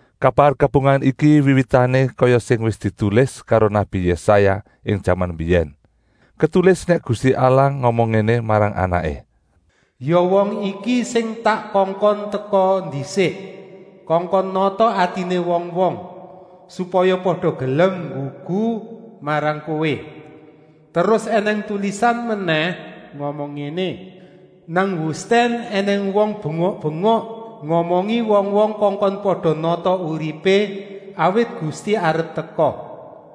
Kabar kabungahan iki wiwitané kaya sing wis ditulis karo nabi Yésaya ing jaman mbiyèn. Ketulis nèk Gusti Allah ngomong ngéné marang Anaké: “Ya wong iki sing tak kongkon teka ndisik, kongkon nata atiné wong-wong, supaya pada gelem nggugu marang Kowé!” Terus ènèng tulisan menèh ngomong ngéné: “Nang wustèn ènèng wong bengok-bengok, ngomongi wong-wong kongkon pada nata uripé, awit Gusti arep teka.”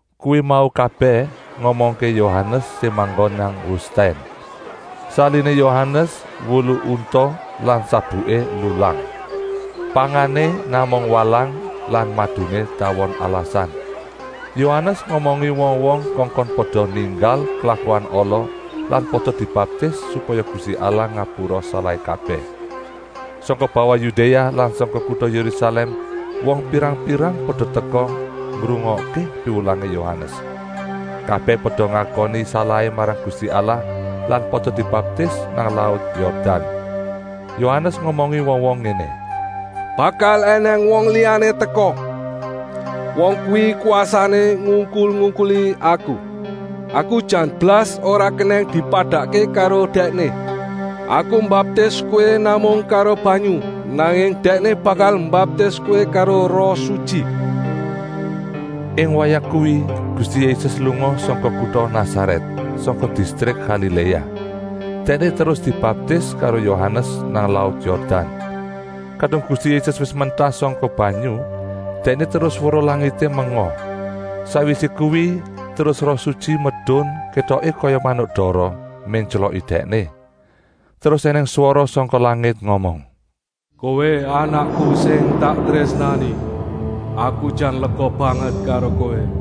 Kuwi mau kabèh ngomongké Yohanes sing manggon nang wustèn. Saliné Yohanes wulu unta lan sabuké lulang. Pangané namung walang lan maduné tawon alasan. Yohanes ngomongi wong-wong kongkon pada ninggal klakuan ala lan pada dibaptis, supaya Gusti Allah ngapura salahé kabèh. Sangka bawah Yudéa lan sangka kuta Yérusalèm wong pirang-pirang pada teka ngrungokké piwulangé Yohanes. Kabèh pada ngakoni salahé marang Gusti Allah lan pada dibaptis nang laut Yordan. Yohanes ngomongi wong-wong ngéné: “Bakal ènèng wong liyané teka. Wong kuwi kwasané ngungkul-ungkuli aku. Aku jan blas ora kenèng dipadakké karo Dèkné! Aku mbaptis kowé namung karo banyu, nanging Dèkné bakal mbaptis kowé karo Roh Sutyi.” Ing wayah kuwi Gusti Yésus lunga sangka kuta Nasarèt, sangka distrik Galiléa. Dèkné terus dibaptis karo Yohanes nang laut Yordan. Kadung Gusti Yésus wis mentas sangka banyu, Dèkné terus weruh langité menga. Sakwisé kuwi terus Roh Sutyi medun kétoké kaya manuk dara, méntyloki Dèkné. Terus ènèng swara sangka langit ngomong: “Kowé Anakku sing tak trésnani. Aku jan lega banget karo Kowé!”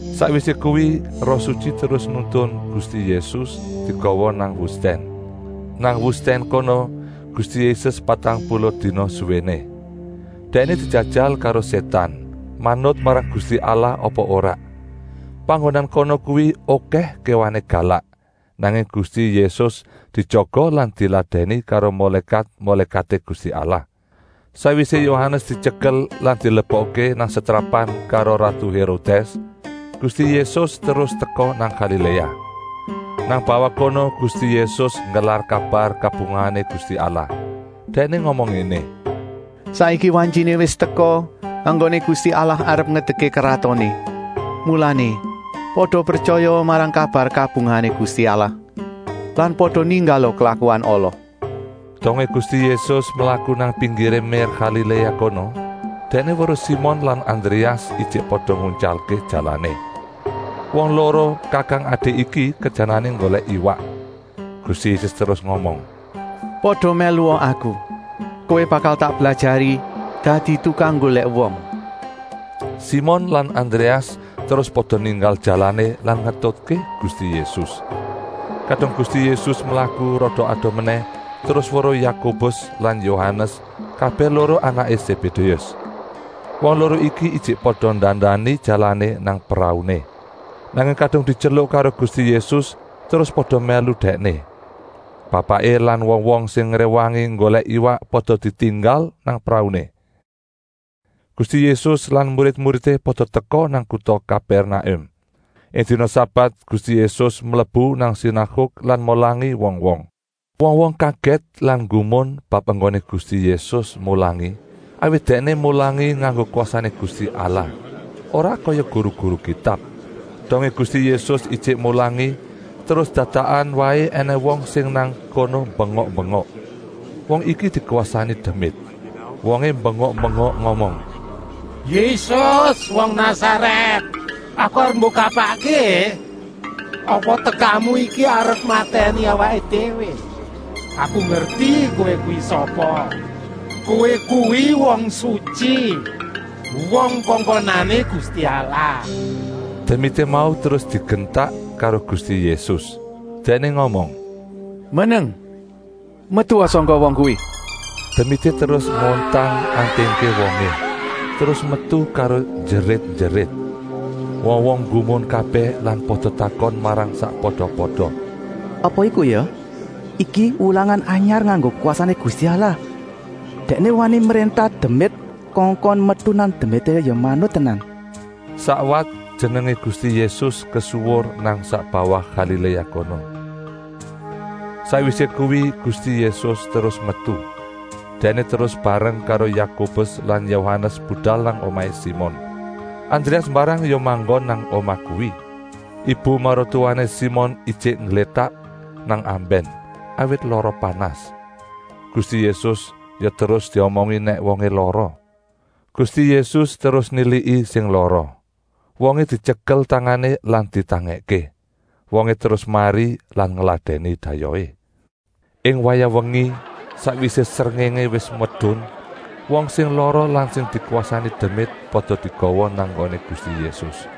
Sakwisé kuwi Roh Sutyi terus nuntun Gusti Yésus digawa nang wustèn. Nang wustèn kono Gusti Yésus patang puluh dina suwéné. Dèkné dijajal karo Sétan, manut marang Gusti Allah apa ora. Panggonan kono kuwi okèh kéwané galak, nanging Gusti Yésus dijaga lan diladèni karo mulékat-mulékaté Gusti Allah. Sakwisé Yohanes dityekel lan dilebokké nang setrapan karo ratu Hérodès, Gusti Yésus terus teka nang Galiléa. Nang bawah kono Gusti Yésus nggelar kabar kabungahané Gusti Allah. Dèkné ngomong ngéné: “Saiki wantyiné wis teka enggoné Gusti Allah arep ngedekké kratoné. Mulané pada pretyayaa marang kabar kabungahané Gusti Allah lan pada ninggala klakuan ala!” Dongé Gusti Yésus mlaku nang pinggiré mér Galiléa kono, Dèkné weruh Simon lan Andréas ijik pada nguntyalké jalané. Wong loro kakang-adi iki kerjanané nggolèk iwak. Gusti Yésus terus ngomong: “Pada mèlua Aku! Kowé bakal tak blajari dadi tukang nggolèk wong.” Simon lan Andréas terus pada ninggal jalané lan ngetutké Gusti Yésus. Kadung Gusti Yésus mlaku rada adoh menèh terus weruh Yakobus lan Yohanes, kabèh loro anaké Sébédéus. Wong loro iki ijik pada ndandani jalané nang prauné. Nanging kadung dityeluk karo Gusti Yésus terus pada mèlu Dèkné. Bapaké lan wong-wong sing ngréwangi nggolèk iwak pada ditinggal nang prauné. Gusti Yésus lan murid-muridé pada teka nang kuta Kapèrnakum. Ing dina sabat Gusti Yésus mlebu nang sinaguk lan mulangi wong-wong. Wong-wong kagèt lan nggumun bab enggoné Gusti Yésus mulangi, awit Dèkné mulangi nganggo kwasané Gusti Allah, ora kaya guru-guru Kitab. Dongé Gusti Yésus ijik mulangi, terus dadakan waé ènèng wong sing nang kono bengok-bengok. Wong iki dikwasani demit. Wongé bengok-bengok ngomong: “Yésus wong Nasarèt, aku arep mbok kapakké? Apa tekamu iki arep matèni awaké déwé? Aku ngerti Kowé kuwi sapa. Kowé kuwi wong sutyi, wong kongkonané Gusti Allah.” Demité mau terus digentak karo Gusti Yésus, Dèkné ngomong: “Meneng! Metua sangka wong kuwi!” Demité terus ngontang-antingké wongé, terus metu karo njerit-njerit. Wong-wong nggumun kabèh lan pada takon marang sakpada-pada: “Apa iku ya? Iki wulangan anyar nganggo kwasané Gusti Allah. Dèkné wani mréntah demit kongkon metu lan demité ya manut tenan.” Sakwat jenengé Gusti Yésus kesuwur nang sak bawah Galiléa kono. Sakwisé kuwi Gusti Yésus terus metu. Dèkné terus bareng karo Yakobus lan Yohanes budal nang omahé Simon. Andréas mbarang ya manggon nang omah kuwi. Ibu maratuwané Simon ijik ngglétak nang ambèn, awit lara panas. Gusti Yésus ya terus diomongi nèk wongé lara. Gusti Yésus terus niliki sing lara. Wongé dityekel tangané lan ditangèkké. Wongé terus mari lan ngladèni dayohé. Ing wayah wengi, sakwisé srengéngé wis medun, wong sing lara lan sing dikwasani demit pada digawa nang nggoné Gusti Yésus.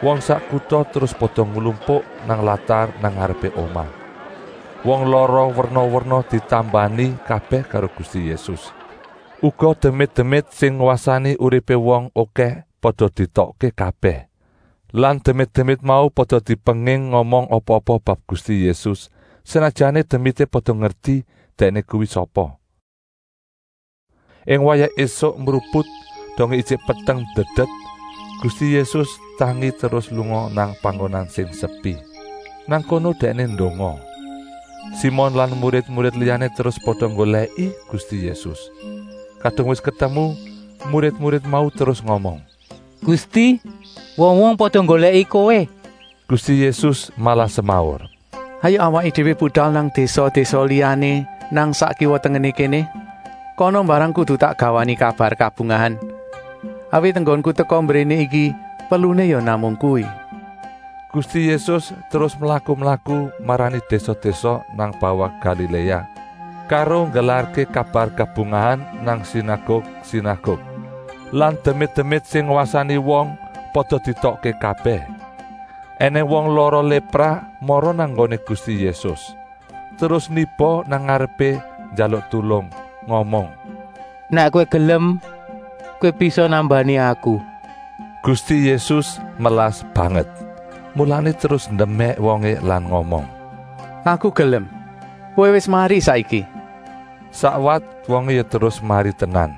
Wong sak kuta terus pada nglumpuk nang latar nang ngarepé omah. Wong lara werna-werna ditambani kabèh karo Gusti Yésus. Uga demit-demit sing ngwasani uripé wong okèh pada dietokké kabèh. Lan demit-demit mau pada dipenging ngomong apa-apa bab Gusti Yésus, senajana demité pada ngerti Dèkné kuwi sapa. Ing wayah ésuk mruput, dongé ijik peteng ndedet, Gusti Yésus tangi terus lunga nang panggonan sing sepi. Nang kono Dèkné ndonga. Simon lan murid-murid liyané terus pada nggolèki Gusti Yésus. Kadung wis ketemu, murid-murid mau terus ngomong: “Gusti, wong-wong pada nggolèki Kowé!” Gusti Yésus malah semaur: “Hayuk awaké déwé budal nang désa-désa liyané nang sak kiwa-tengené kéné. Kana mbarang kudu tak gawani kabar kabungahan, awit enggonku teka mbréné iki perluné ya namung kuwi.” Gusti Yésus terus mlaku-mlaku marani désa-désa nang bawah Galiléa karo nggelarké kabar kabungahan nang sinaguk-sinaguk. Lan demit-demit sing ngwasani wong pada dietokké kabèh. Enèng wong lara lépra mara nang nggoné Gusti Yésus, terus niba nang ngarepé njaluk tulung ngomong: “Nèk Kowé gelem, Kowé bisa nambani aku!” Gusti Yésus melas banget, mulané terus ndemèk wongé lan ngomong: “Aku gelem! Kowé wis mari saiki!” Sakwat wongé ya terus mari tenan.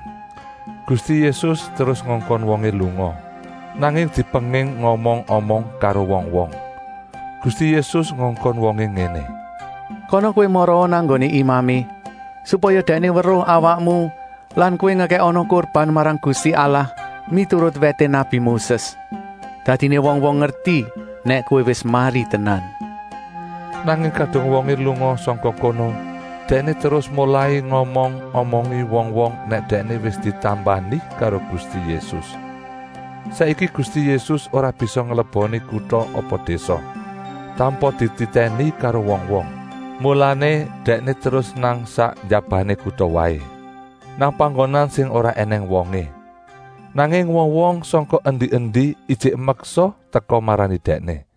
Gusti Yésus terus ngongkon wongé lunga, nanging dipenging ngomong-omong karo wong-wong. Gusti Yésus ngongkon wongé ngéné: “Kana kowé maraa nang nggoné imamé, supaya dèkné weruh awakmu lan kowé ngekèkana kurban marang Gusti Allah miturut wèté nabi Moses. Dadiné wong-wong ngerti nèk kowé wis mari tenan.” Nanging kadung wongé lunga sangka kono, dèkné terus molai ngomong-omongi wong-wong nèk dèkné wis ditambani karo Gusti Yésus. Saiki Gusti Yésus ora bisa ngleboni kuta apa désa, tanpa dititèni karo wong-wong. Mulané Dèkné terus nang sak njabané kuta waé, nang panggonan sing ora ènèng wongé. Nanging wong-wong sangka endi-endi ijik meksa teka marani Dèkné.